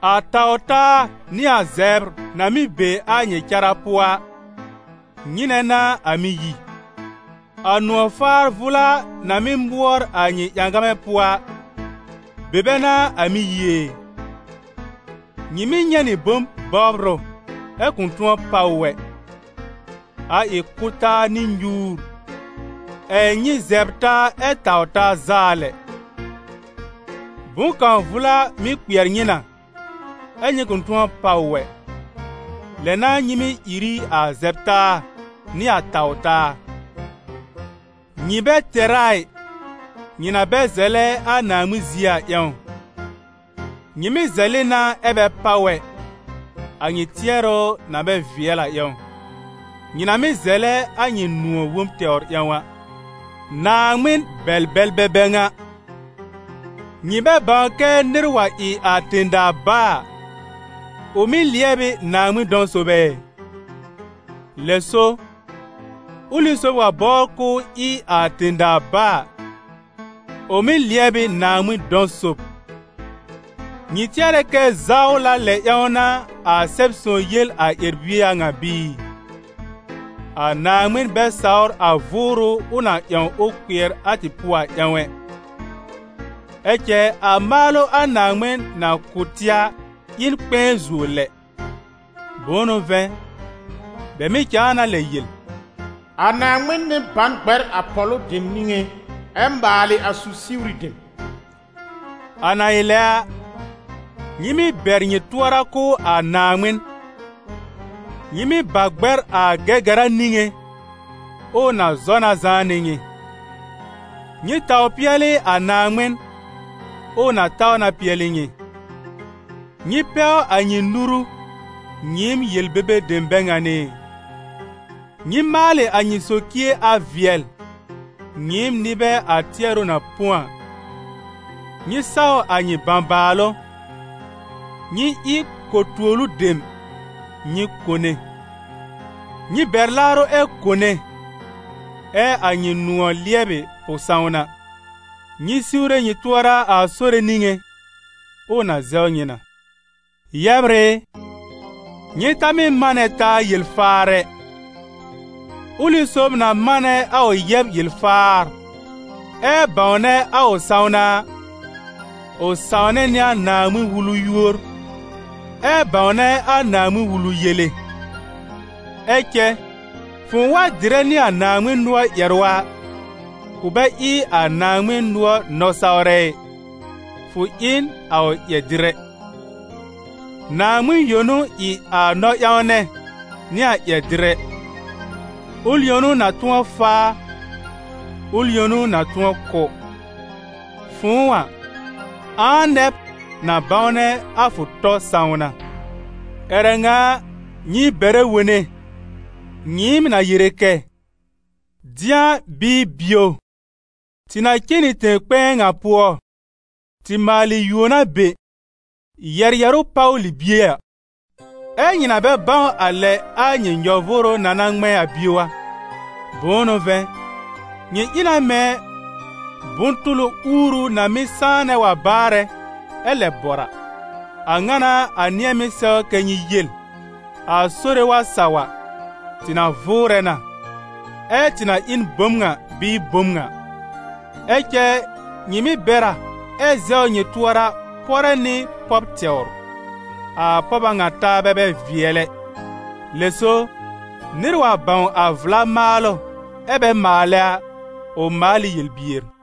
A taw-taa nɩ a zɛbr na mɩ́ be a nyɩ cara pʋɔ a, nyɩnɛ n'a a mɩ́ yi? A nʋ̃ɔ̀ faar vʋla na mɩ́ mʋɔr a nyɩ ƴãgamɛ pʋɔ a, be bɛ n'a a mɩ́ yi ɛ? Nyɩ mɩ́ nyɛ̃ nɩ bom bɔbr ʋ ɛ kʋ̃ tʋ̃ɔ páw ʋ ɛ, a ɩ kʋ́-taa nɩ nyuur, ɛ̀ nyɩ zɛbr taa ɛ tawr taa zaa lɛ. Bʋ̃-kãw vʋla mɩ́ kpɩɛr nyɩ na, ɛ́ nyɩ kʋ̃ tʋ̃ɔ páw ʋ ɛ, lɛ n'a nyɩ mɩ́ ìr ɩ a zɛb-taa nɩ a taw-taa. Nyɩ bɛ tɛr a ɩ, nyɩ na bɛ zɛlɛ a Naaŋmɩn zie a ƴãw. Nyɩ mɩ́ zɛlɩ na ɛ bɛ páw ɛ, a nyɩ tɩɛrʋ na bɛ vɩɛl a ƴãw: nyɩ na mɩ́ zɛlɛ a nyɩ nʋ̃ɔ̀ wob tɛwr ƴãw a. Naaŋmɩn bɛl-bɛlbɛ bɛ ŋa! Nyɩ bɛ bãw kɛ́ nɩr wa ɩ a tẽ-daa bá a, ʋ mɩ́ lɩɛb ɩ Naaŋmɩn dɔ̃ sob ɛ? Lɛ so, ʋlɩ sob wa bɔbr k'ʋʋ ɩ a tẽ-daa bá a, ʋ mɩ́ lɩɛb ɩ Naaŋmɩn dɔ̃ sob. Nyɩ tɩɛrɛ kɛ́ zawla lɛ ƴãw n'a a Sɛb-sõw yel a ƴɛr-bie a ŋa bɩɩ? «A Naaŋmɩn bɛ sawr a vʋʋrʋ ʋ na ƴãw ʋ kpɩɛr a tɩ pʋɔ a ƴãw ɛ.» Ɛ cɛ a maalʋ a Naaŋmɩn na kʋ̀ tɩ a ɩ n kpɛ̃ɛ zuo lɛ. Bʋ̃ʋ n'ʋ vɛ̃, bɛ mɩ̀ cãa na lɛ yel: «A Naaŋmɩn mɩ́ ba n gbɛr a pɔ̀lʋ dem niŋé, ɛ maalɩ a su-siwri dem.» A na ɩ lɛ a, nyɩ mɩ́ bɛr nyɩ tʋɔra kʋ̀ a Naaŋmɩn; nyɩ mɩ́ ba gbɛr a Gɛgɛra niŋé, ʋʋ na zɔ na zãá nɩ nyɩ. Nyɩ taw pɩɛlɩ a Naaŋmɩn, ʋʋ na taw na pɩɛlɩ nyɩ. Nyɩ pɛw a nyɩ nuru, nyɩɩm yel-bebe dem bɛ ŋan ɩ; nyɩ maalɩ a nyɩ socie a vɩɛl, nyɩɩm nɩbɛ a tɩɛrʋ na põ a! Nyɩ saw a nyɩ bãbaalʋ, nyɩ ɩ ko-tuolu dem, nyɩ kone; nyɩ bɛr laarʋ ɛ kone, ɛ a nyɩ nʋ̃ɔ̀ lɩɛbɩ pʋ-sãwna. Nyɩ siwre nyɩ tʋɔra a Sore niŋé, ʋʋ na zɛw nyɩ na. Yɛbr ɩ, nyɩ ta mɩ́ manɛ taa yel-faar ɛ. Ʋlɩ sob na manɛ a ʋ yɛb yel-faar, ɛ bãwnɛ a ʋ sãwna a, ʋ sãwnɛ nɩ a Naaŋmɩn-Wulu yúor, ɛ bãwnɛ a Naaŋmɩn-Wulu yele. Ɛ cɛ fʋ̃ʋ wa dɩrɛ nɩ a Naaŋmɩn nʋɔr ƴɛrʋ a, fʋ bɛ ɩ a Naaŋmɩn nʋɔr nɔ-sawrɛ ɩ, fʋ ɩ n a ʋ ƴɛr-dɩrɛ. Naaŋmɩn yõ n'ʋ ɩ a nɔ-ƴãwnɛ nɩ a ƴɛr-dɩrɛ; ʋl yõ n'ʋ na tʋ̃ɔ faa, ʋl yõ n'ʋ na tʋ̃ɔ kʋ́. Fʋ̃ʋ a, ãa nɛ b, na bãwnɛ a fʋ tɔ sãwna? Ƴɛrɛ ŋa a, nyɩ bɛrɛ wone, nyɩɩm na yere kɛ́: «Dɩ̃a bɩɩ bio, tɩ na cen nɩ tẽ-kpɛ̃ɛ ŋa pʋɔ, tɩ maalɩ yuon a be, yɛ̀r yɛ̀rʋ́ páw libie a.» Ɛ́ nyɩ na bɛ bãw a lɛ a nyɩ nyɔ-vʋʋrʋ na na ŋmɛ̃ a bio a! Bʋ̃ʋ n'ʋ vɛ̃, nyɩ ɩ na mɛ̃ bʋ̃-tʋlʋ uuru na mɩ́ sãanɛ wa baarɛ ɛ lɛ bɔr a. A ŋa n'a a nɩ̃ɛ mɩ́ sɛw kɛ́ nyɩ yel: «A Sore wa saw a, tɩ na vʋʋrɛ na, ɛ tɩ na ɩ n bom ŋa bɩɩ bom ŋa.» Ɛ cɛ nyɩ mɩ́ bɛr a ɛ zɛwr nyɩ tʋɔra pɔrɛ nɩ pɔb tɛwr. A pɔb a ŋa taabɛ bɛ vɩɛl ɛ. Lɛ so, nɩr wa bãw a vla maalʋ ɛ bɛ maalɛ a, ʋ maal ɩ yel-bier.